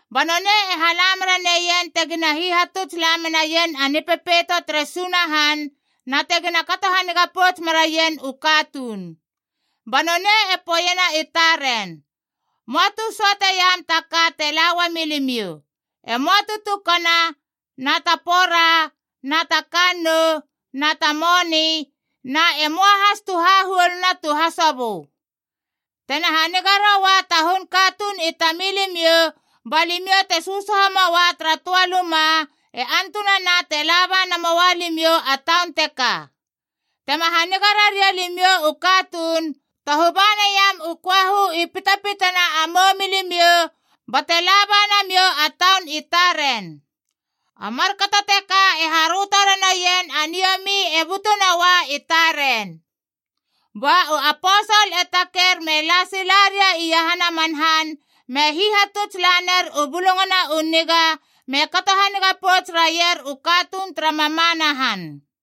Ba nonei e hala mera neien tegina hihatutsla menaien a Nipepeito tere Sunahan na tegina kato haniga pouts meraien u katuun. Ba nonei e poeiena i taren, “Möa tu söateiam ta ka te la uamilimiou, e möa tu tukana na ta pora, na ta kannou na ta moni, na e möa has tu hahuoluna tu hasobö. Tena haniga roa ta hun katuun i tamilimiou, ba limiou te sösoho moa tara töa luma, e antunana te laba namoua limiou a taun teka. Tema haniga raria limiou u katuun, tohu ba naiam u köahu i pitpitana a moumilimiou bate laba namiou a taun i taren. A markato teka e haröto ranoien a niomi e butu noua i taren.” Ba u aposol e taker me la sila ria iahana man han, me hihatuts laner u Bulungana u Niga me kato haniga pouts raier u katuun tara mamana han.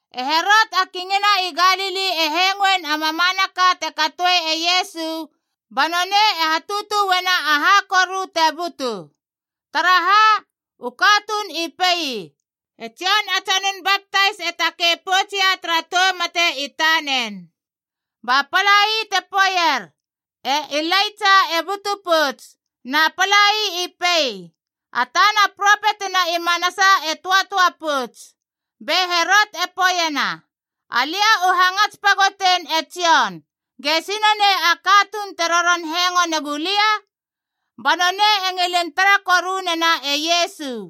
E Herot a Kingina i Galili e hengoein a mamanaka te katoe e Iesu ba nonei e hatutue na aha koru te butu. Taraha? U katuun i pei, “E Jon a Tsonun Baptais e takei poutsia tara tou mate i tanen!” Ba palai te poeier, “E Ilaitsa e butu pouts,” na palai i pei, “A tana propetina i manasa e töatöa pouts.” Be Herot e poeiena, “Alia u hangats pagotein e Jon! Gesi nonei a katuun te roron hengo negu lia?” Ba nonei e ngilin tara koru nena e Iesu.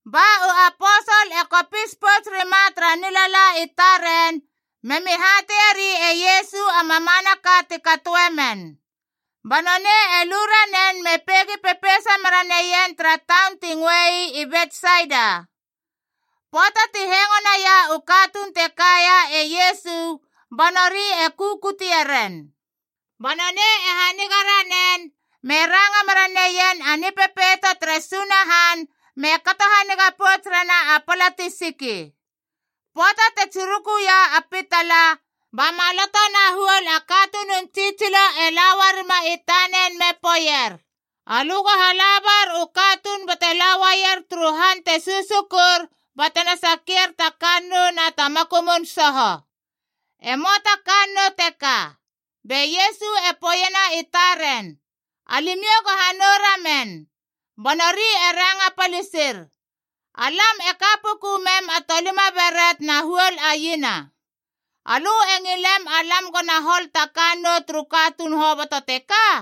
Ba u aposol e kopis pouts rima tara nilala i taren memi hateieri e Iesu a mamanaka ti katoe men. Ba nonei e lu ranen me peigi pepeisa meraneien tara taun ti ngöe ii Betsaida. Pöata ti hengo naia u katuun te kaia e Iesu ba nori e kukutie ren. Ba nonei e haniga ranen me ranga mera neien a Nipepeito tere Sunahan, me kato haniga pouts rena a pala ti siki. Pöata te tsirukuia a pitala, ba maloto na huol a katunun tsitsilo e la uarima i tanen me poeier, “Alö go hala bar u katuun bate la uaier turu han te susukur batena sakier ta kannou na ta makumun soho. E möa ta kannou teka.” Be Iesu e poeiena i taren, “Alimiou go hanou ramen!” Ba nori e ranga palisir, “Alam e ka puku mem a tolima beret na huol a iena. Alö e ngilem alam gona hol ta kannou turu katuun hoboto teka?”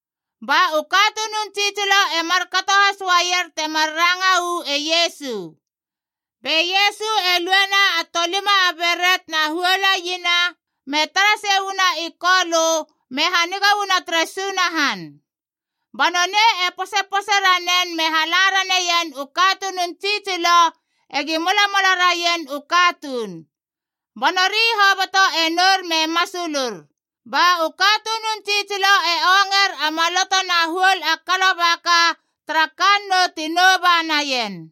Ba u katunun tsitsilo e markato has uaier temar ranga uu e Iesu. Be Iesu e luena a tolima a beret na huol a iena, me tara sei uana i Kolö, me haniga uana tere Sunahan. Ba nonei e posepose ranen me hala raneien u katunun tsitsilo egi molamola raien u katuun. Ba nori hoboto e nour me masulur. Ba u katunun tsitsilo e onger a maloto na huol a kalobaka tara kannou ti nouba naien.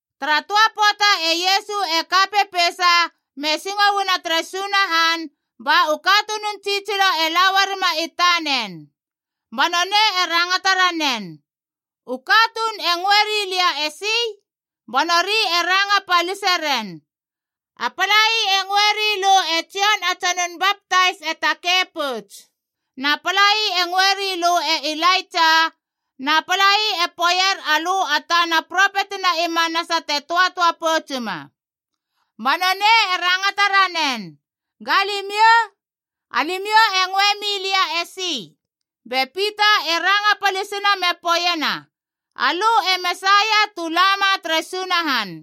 Tara töa pöata e Iesu e ka pepeisa me singo uana tere Sunahan, ba u katunun tsitsilo e la uarima i tanen. Ba nonei e rangata ranen, “U katuun e ngöe rilia esi?” Ba nori e ranga palise ren, “A palai e ngöe rilö e Jon a Tsonun Baptais e takei pouts. Na palai e ngöe rilö e Ilaitsa, na palai e poeier alö a tana propetina i manasa te töatöa poutsuma.” Ba nonei e rangata ranen, “Ga limiou? Alimiou e ngöe milia esi?” Be Pita e ranga palisina me poeiena, “Alö e Mesaia tu lama tere Sunahan!”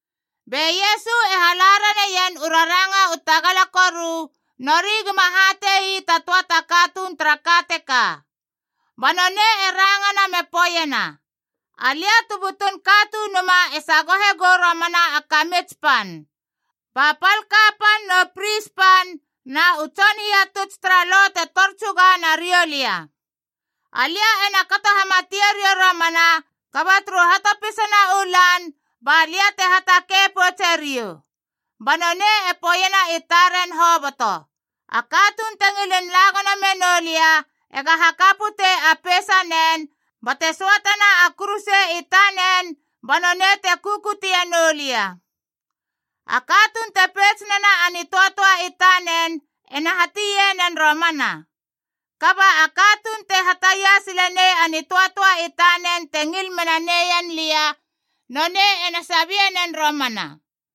Be Iesu e hala raneien u raranga u tagala koru, nori gima hate ii ta töa ta katuun tara ka teka. Ba nonei e rangana me poeiena, “Alia tu butun Katunuma e sagohe gou romana a kamits pan. Ba pal kapan nu pris pan na u tson hihatuts tara Lo te tor tsuga nariou lia. Alia ena kato hamatie riou romana, kaba turu hatopisana u lan ba lia te hatakei poutse riou.” Ba nonei e poeiena i taren hoboto, “A katuun te ngilin la gono menoulia ega haka putei a peisanen bate söatena a kuruse i tanen ba nonei te kukutie noulia. A katuun te peits nena a nitöatöa i tanen ena hatie nen romana. Kaba a katuun te hataia sile nei a nitöatöa i tanen te ngil mena neien lia, nonei ena sabie nen romana.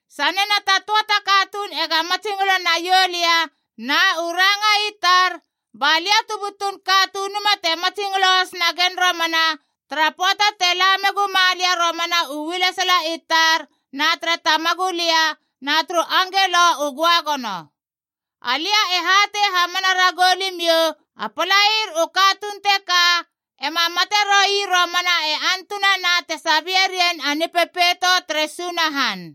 Sanena ta töa ta katuun ega matsingolo naioulia na u ranga i tar, ba lia tu butun Katunuma te matsingolo has nagen romana tara pöata te la meguma lia romana u ualesala i tar na tere Tamagulia na turu angelo u göagono. Alia e hatei hamana ragou limiou, a palair u katuun teka ema mate roui romana e antunana tena sabie rien a Nipepeito tere Sunahan.”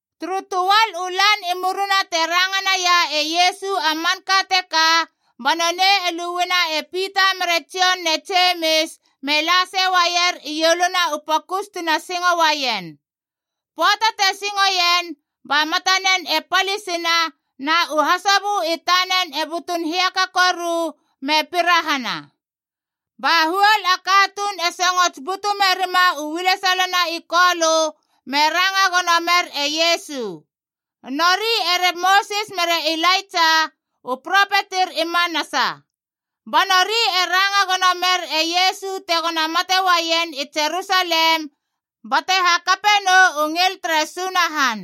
Turu töal u lan i murina te ranga naia e Iesu a manka teka, ba nonei e luena e Pita mere Jon ne Jemis me la sei uaier ieluna u pokus tina singouaien. Pöata te singoien, ba matanen e palisina, na u hasobö i tanen e butun hiaka koru, me pirahana. Ba huol a katuun e songots butu merima u ualesalana i Kolö me ranga gono mer e Iesu. Nori ere Mosis mere Ilaitsa, u propetir i manasa. Ba nori e ranga gono mer e Iesu tegona mate uaien i Jerusalem bate hakape nou u ngil tere Sunahan.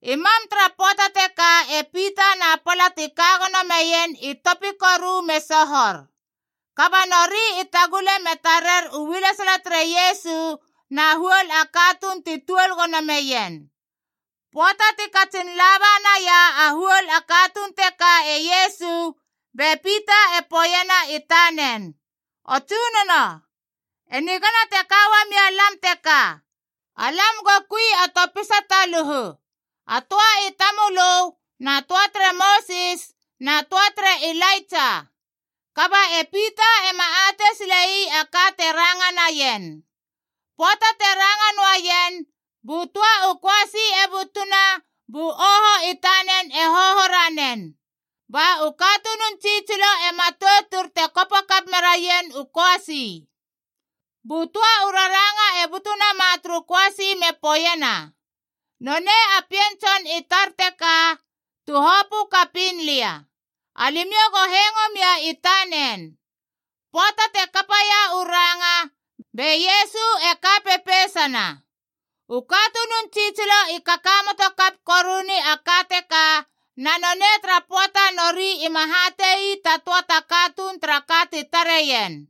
I mam tara pöata teka e Pita na pala ti ka gono meien i topi koru me sohor. Kaba nori i tagule me tarer u ualesala tere Iesu na huol a katuun ti tuol gono meien. Pöata ti katsin laba naia a huol a katuun teka e Iesu, be Pita e poeiena i tanen, “O Tsunono, e nigana te ka uamia lam teka. Alam go kui a topisa taluhu, a töa i tamölö, na töa tere Mosis, na töa tere Ilaitsa.” Kaba e Pita ema atei sile ii a ka te ranga naien. Pöata te ranga noaien, bu töa u köasi e butuna bu oho i tanen e hoho ranen. Ba u katunun tsitsilo e matoutur te kopo kap meraien u köasi. Bu töa u raranga e butu nama turu köasi me poeiena, “Nonei a Pien Tson i tar teka, tu hopö kapiin lia. Alimiou go hengo mia i tanen!” Pöata te kapaia u ranga, be Iesu e ka pepeisana. U katunun tsitsilo i kakamoto kap koruni a ka teka, na nonei tara pöata nori ima hate ii ta töa ta katuun tara ka ti tareien.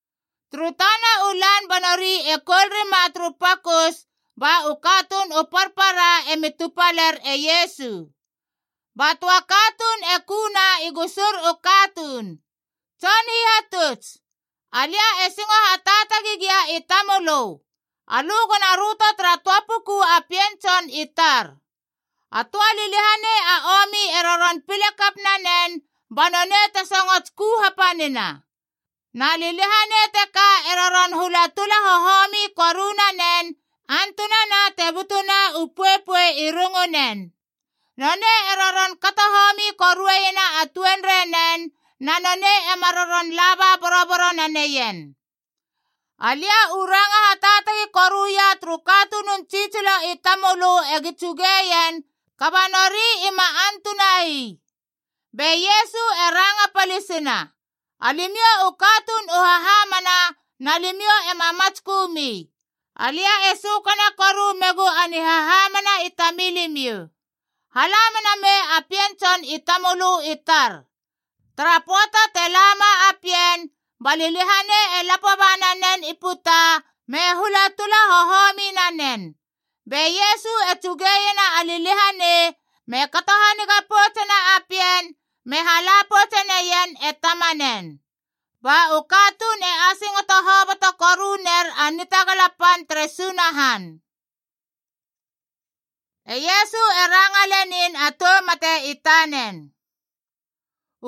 Turu tana u lan ba nori e koul rima turu pokus, ba u katuun u parpara emi tupaler e Iesu. Ba töa katuun e kuna i gusur u katuun, “Tson Hihatuts, alia e singo hataatagi gia i tamölö, alö gona röto tara töa puku a pien tson i tar! A töa liliahanei a omi e roron pile kap nanen, ba nonei te songots ku hapanina.a Na liliahanei teka e roron hula tula hohomi koru nanen, antunana te butuna u poepoe i rungunen. Nonei e roron kato homi koruena a tuenrei nen, na nonei ema roron laba boroboro naneien. Alia u ranga hataatagi koruia turu katunun tsitsilo i tamölö egi tsugeien, kaba nori ima antuna ii.” Be Iesu e ranga palisina, “Alimiou u katuun u hahamana na limiou ema matskömi! Alia e sökana koru megu a nihahamana i tamilimiou! Hala mena mei a pien tson i tamölö i tar.” Tara pöata te lama a pien, ba liliahanei e lapo ba nanen i puta me hula tula hohomi nanen. Be Iesu e tsuge iena a liliahanei, me kato haniga poutsena a pien, me hala poutse neien e tamanen. Ba u katuun e asingoto hoboto koru ner a nitagala pan tere Sunahan. E Iesu e ranga lenin a tou mate i tanen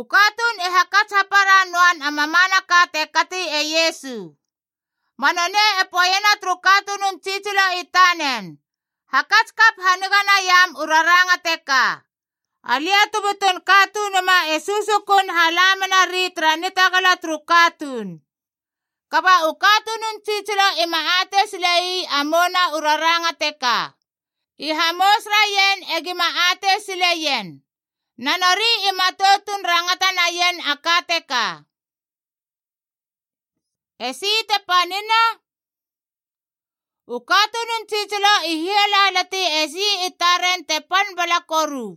U katuun i hakats hapara noan a mamanaka te kati e Iesu. Ba nonei e poeiena turu katunun tsitsilo i tanen, “Hakats kap haniga naiam u raranga teka: Alia tu butun Katunuma e susukun hala menari tara nitagala turu katuun.” Kaba u katunun tsitsilo i ma atei sile ii a mouna u raranga teka. I hamous raien e gima atei sileien. Na nori i matoutun rangata naien a ka teka. Esi te panina? U katunun tsitsilo i hialalati esi i taren te pan bala koru.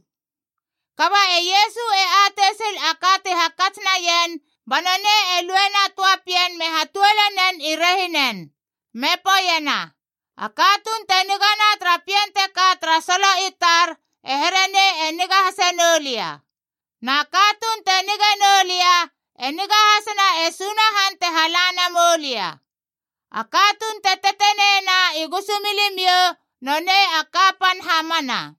Kaba e Iesu e atei sil a ka ti hakats naien, ba nonei e luena töa pien me hatuole nen i rehinen. Me poeiena, “A katuun te nigana tara pien teka tara solo i tar e here nei e niga hase noulia. Na katuun te nige noulia e niga hasena e Sunahan te hala namoulia. A katuun te teteneina i gusumilimiou nonei a kapan hamana.”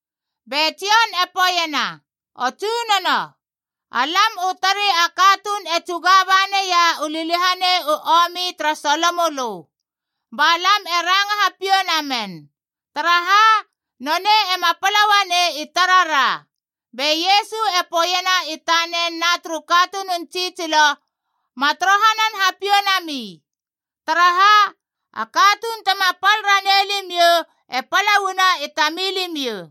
Be Jon e poeiena, “O Tsunono, alam u tari a katuun e tsuga ba neia u liliahanei u omi tara solomölö. Ba lam e ranga hapiou namen. Taraha? Nonei ema pala uanei i tarara.” Be Iesu e poeiena i tanen na turu katunun tsitsilo, “Ma torohanan hapiou nami. Taraha? A katuun tema pal ranei limiou e pala uana i tamilimiou.”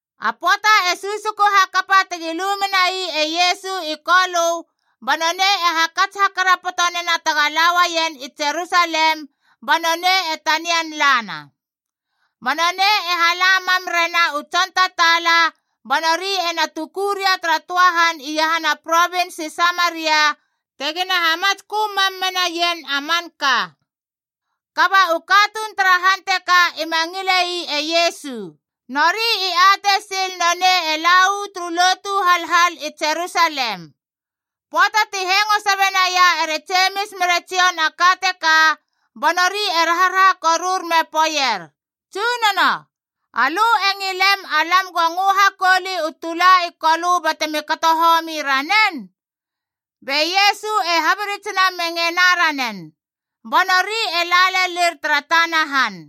A pöata e susuku hakapa tegi lu menai e Iesu i Kolö, ba nonei e hakats hakarapoto nena tega la uaien i Jerusalem, ba nonei e tanian lana. Ba nonei e hala mam rena u tson tataala, ba nori e na tuku ria tara töa han iahana provins i Samaria tegina hamatskö mam menaien a manka. Kaba u katuun tara han teka ima ngile ii e Iesu. Nori i atei sil nonei e la uu turu lotu halhal i Jerusalem. Pöata ti hengo sabe naia ere Jemis mere Jon a ka teka, ba nori e raharaha korur me poeier, “Tsunono, alö e ngilem alam ego ngö hakouli u tula i Kolö batemi kato homi ranen?” Be Iesu e habiritsina me ngena ranen. Ba nori e la lelir tara tana han.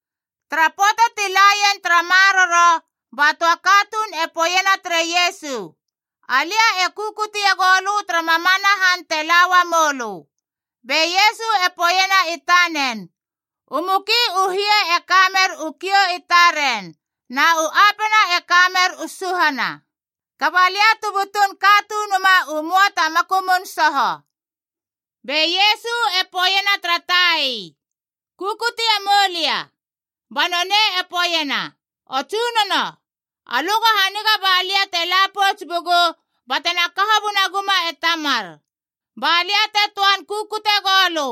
Tara pöata ti la ien tara maroro, ba töa katuun e poeiena tere Iesu, “Alia e kukutie goulö tara mamana han te la uamou lö.” Be Iesu e poeiena i tanen, “U muki u hie e ka mer u kiou i taren, na u apena e ka mer u suhana. Kaba lia tu butun Katunuma u möa ta makumun soho.” Be Iesu e poeiena tara tai, “Kukutie moulia.” Ba nonei e poeiena, “O Tsunono, alö go haniga ba lia te la pouts bugu batena kaho bunaguma e tamar, ba lia te töan kukute goulö.”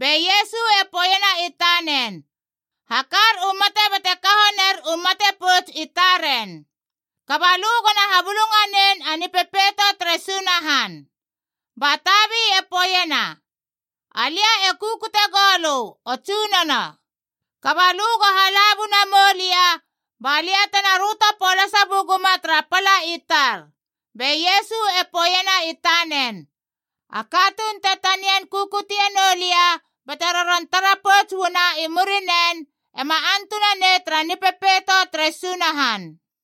Be Iesu e poeiena i tanen, “Hakar u mate bate kaho ner u mate pouts i taren. Kaba lö gona habulunganein a Nipepeito tere Sunahan.” Ba tabi e poeiena, “Alia e kukute gou lö, O Tsunono. Kaba lö go hala buna moulia ba lia tena röto polasa buguma tara pala i tar.” Be Iesu e poeiena i tanen, “A katuun te tanian kukutie noulia bate roron tara pouts uana i murinen, ema antunanei tara Nipepeito tere Sunahan.”